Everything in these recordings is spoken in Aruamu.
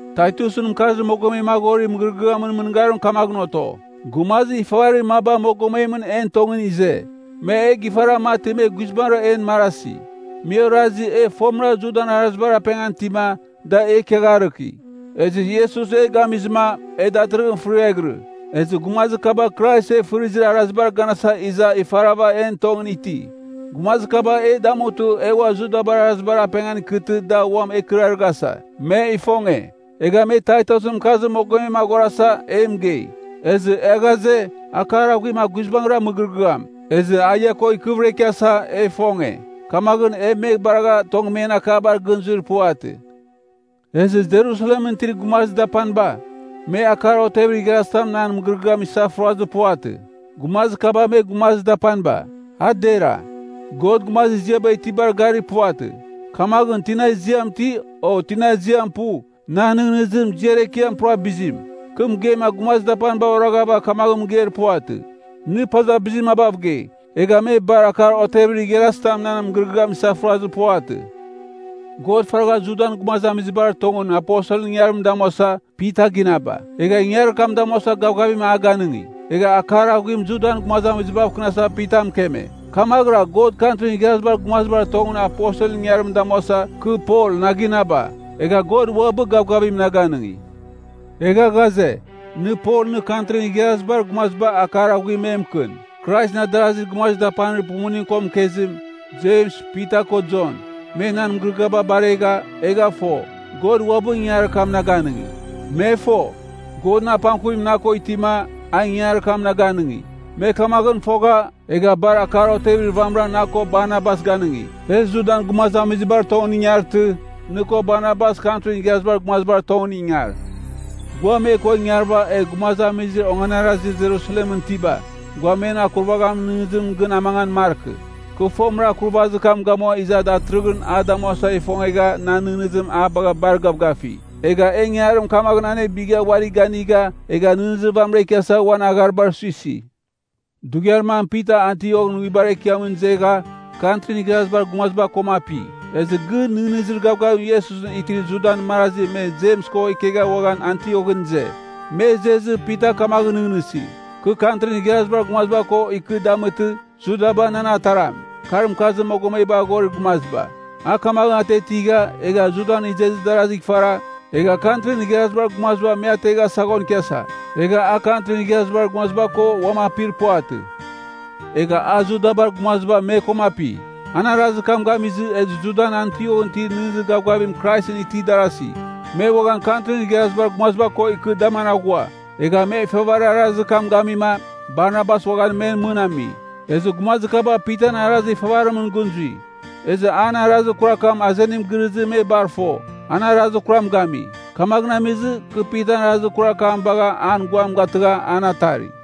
Taitusɨn mɨkarzir mogomem aghorir mɨgɨrɨgɨamɨn mɨngarim kamaghɨn oto. Gumazir ifavarir maba mogomemɨn en tongɨn ize. Me e gifara mati me guizbangɨra en marasi. Me orazi, e fomɨra Judan arazibar apengan itima, da e ikiagharɨki, ezɨ Iesus e gamizɨma, e datɨrɨghɨn fɨriaghɨrɨ. Ezɨ gumazir kaba Krais e fɨrizir arazibar ganasa iza ifarava en tongɨn iti. Gumazir kaba e damutɨ e ua Judabar arazibar apengan ikɨtɨ da uam e ikɨrarɨghasa, me ifonge. Egha me Taitusɨn mɨkarzir mogomem aghorasa, e mɨgei. Ezɨ e ghaze, akar aghuim a guizbangɨra mɨgɨrɨgɨam, ezɨ a ia ko ikɨvɨra ikiasa, e ifonge. Kamaghɨn e me baragha tong men akabar gɨn zuir puvatɨ. Ezɨ Jerusalemɨn itir gumazir dapaniba, me akar otevir igharazitam nan mɨgɨrɨgɨam isafurazir puvatɨ. Gumazir kaba me gumazir dapaniba, a dera. God gumazir ziaba itibar garir puvatɨ. Kamaghɨn, tina ziam iti, o tina ziam pu, nan nɨghnɨzim, ziar ekiam pura bizim. Kɨ mɨgeima gumazir dapaniba oraghava kamaghɨn mɨgeir puvatɨ, “Nɨ paza bizir mabav gei.” Egha me bar akar otevir igharazitam nan mɨgɨrɨgɨam isafurazir puvatɨ. God faragha Judan gumazamizibar tongɨn aposelɨn ingangarim damuasa, Pita ginaba. Egha ingangarim damuasa gavgavim a ganɨngi. Egha akar aghuim Judan gumazamizibav kɨnasa Pita mɨkeme. Kamaghɨra God Kantrin Igharazibar Gumazibar tongɨn aposelɨn ingangarim damuasa, kɨ Pol na ginaba, egha God uabɨ gavgavim na ganɨngi. Egha ghaze, nɨ Pol nɨ Kantrin Igharazibar Gumaziba akar aghuim me mɨkɨn. Kraisɨn adarazir gumazir dapanir pumuning ko mɨkezim, Jems, Pita ko Jon, me nan mɨgɨrɨgɨaba baregha, egha fo, God uabɨ ingangarir kam na ganɨngi. Me fo, Godɨn apangkuvim na ko itima, a ingangarir kam na ganɨngi. Me kamaghɨn fogha, egha bar akar otevir vamɨra na ko Barnabas ganɨngi, “E Judan gumazamizibar tongɨn ingartɨ, nɨ ko Barnabas Kantrin Igharazibar Gumazibar tongɨn ingar. Gua me ko ingarɨva egh gumazamizir onganarazir Jerusalemɨn itiba, gua men akurvaghamin nɨghnɨzim gɨn amangan markɨ.” Kɨ fomɨra akurvazir kam gamua iza datɨrɨghɨn a damuasa ifongegha nan nɨghnɨzim a bagha bar gavgafi. Egha e ingangarim kamaghɨn anebɨgha uari ganigha, egh nɨghnɨzir vamɨra ikiasa uan agharibar suisi. Dughiar mam Pita Antioghɨn nguibar ekiamɨn izegha, Kantrin Igharazibar Gumaziba koma api. Ezɨ gɨn nɨghnɨzir gavgavim Iesusɨn itir Judan marazi me Jems ko ikegha uaghan Antioghɨn ize. Me izezɨ, Pita kamaghɨn nɨghnɨsi, kɨ Kantrin Igharazibar Gumaziba ko ikɨva damɨtɨ, Judaba nan ataram, kar mɨkarzir mogomebar aghorir gumaziba. A kamaghɨn atiatigha, egha Judan izezir darazigh ifara, egha Kantrin Igharazibar Gumaziba me ategha saghon ikiasa. Egha a Kantrin Igharazibar Gumaziba koma uam apir puvatɨ. Egha a Judabar gumaziba me koma api. An arazir kam gamizɨ, ezɨ Judan Antioghɨn itir nɨghnɨzir gavgavim Iesusɨn itir darasi, me uaghan Kantrin Igharazibar Gumaziba ko ikɨ daman aghua. Egha me ifavarir arazir kam gamima, Barnabas uaghan men mɨn ami. Ezɨ gumazir kaba Pitan arazir ifavarimɨn gɨn zui. Ezɨ an arazir kurar kam azenim girɨzɨ me bar fo, an arazir kuram gami. Kamaghɨn amizɨ, kɨ Pitan arazir kurar kam bagha an guam gatɨgha an atari.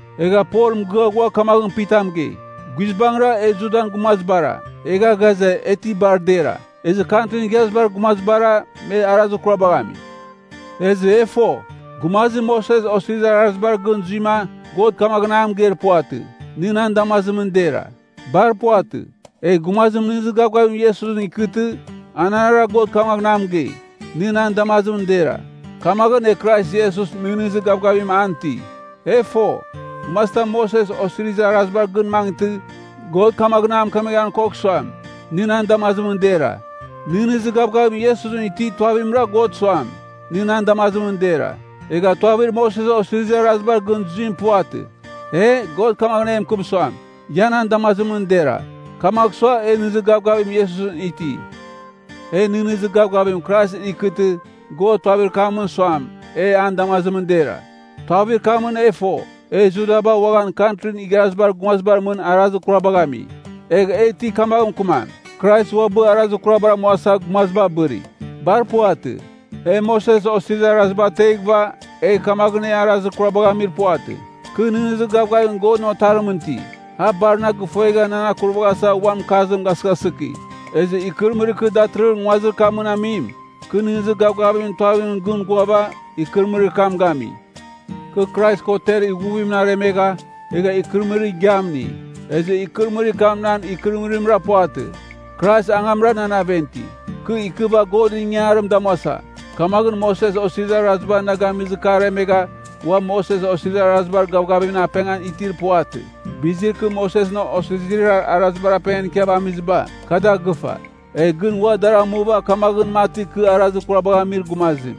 Egha Pol mɨgɨa ghua kamaghɨn Pita mɨgei, “Guizbangɨra, e Judan gumazibara, egha ghaze, e ti bar dera. Ezɨ Kantrin Igharazibar Gumazibara, me arazir kurabagh ami. Ezɨ e fo, gumazim Moses Osizirir Arazibar gɨn zuima, God kamaghɨn a mɨgeir puvatɨ, nɨ nan damazimɨn dera. Bar puvatɨ. Egh gumazim nɨghnɨzir gavgavim Iesusɨn ikɨtɨ, anarɨra God kamaghɨn a mɨgei, nɨ nan damazimɨn dera. Kamaghɨn e Krais Iesus nɨghnɨzir gavgavimɨn an ti. E fo, gumazitam Moses Osirizir Arazibar gɨn mangɨtɨ, God kamaghɨn a mɨkemeghan kogh suam, nɨ nan damazimɨn dera. Nɨghnɨzir gavgavim Iesusɨn itir tuavimra God suam, nɨ nan damazimɨn dera. Egha tuavir Moses Osirizir Arazibar gɨn zuim puvatɨ. E, God kamaghɨn e mɨkɨm suam, ia nan damazimɨn dera, kamagh sua, e nɨghnɨzir gavgavim Iesusɨn iti. “E nɨghnɨzir gavgavim Kraisɨn ikɨtɨ, God tuavir kamɨn suam, e an damazimɨn dera. Tuavir kamɨn e fo, e Judaba uaghan Kantrin Igharazibar Gumazibar mɨn arazir kurabagh ami. Egh e ti kamaghɨn mɨkɨmam, Krais uabɨ arazir kurabar amuasa, gumaziba abɨri. Bar puvatɨ. E, Moses Osirizir Araziba ateghɨva, egh kamaghɨn e arazir kurabagh amir puvatɨ. Kɨ nɨghnɨzir gavgavim Godɨn Otarimɨn iti. A bar na gifuegha nan akurvaghasa uan mɨkarzim gasɨghasɨki. Ezɨ ikɨrɨmɨrir kɨ datɨrɨghɨn nguazir kamɨn amim, kɨ nɨghnɨzir gavgavimɨn tuavimɨn gɨn ghuava, ikɨrɨmɨrir kam gami. Kɨ Krais ko ter ighuvimɨn aremegha, egha ikɨrɨmɨrir igiam ini. Ezɨ ikɨrɨmɨrir kam a nan ikɨrɨmɨrimra puvatɨ. Krais angamra nan aven iti. Kɨ ikɨva Godɨn ingangarim damuasa, kamaghɨn Moses Osirizir Araziba na gamizɨ kɨ aremegha ua Moses Osirizir Arazibar gavgavimɨn apengan itir puvatɨ. Bizir kɨ Mosesɨn Osirizir Arazibar apengan ikiava amiziba, kɨ da gɨfa. Egh gɨn ua dar amuva kamaghɨn mati kɨ arazir kurabagh amir gumazim.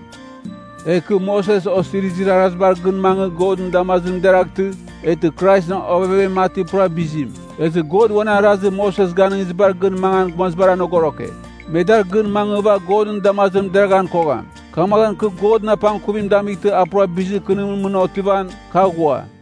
Egh kɨ Moses Osirizir Arazibar gɨn mangɨ Godɨn damazimɨn deraghtɨ, eghtɨ Kraisɨn ovevem mati pura bizim. Ezɨ God uan arazir Moses ganɨngizibar gɨn mangan gumazibar anogoroke. Me dar gɨn mangɨva Godɨn damazimɨn deraghan kogham. Kamaghɨn kɨ Godɨn apangkuvim damightɨ a pura bizir kɨnimɨn mɨn otivan, kɨ aghua.”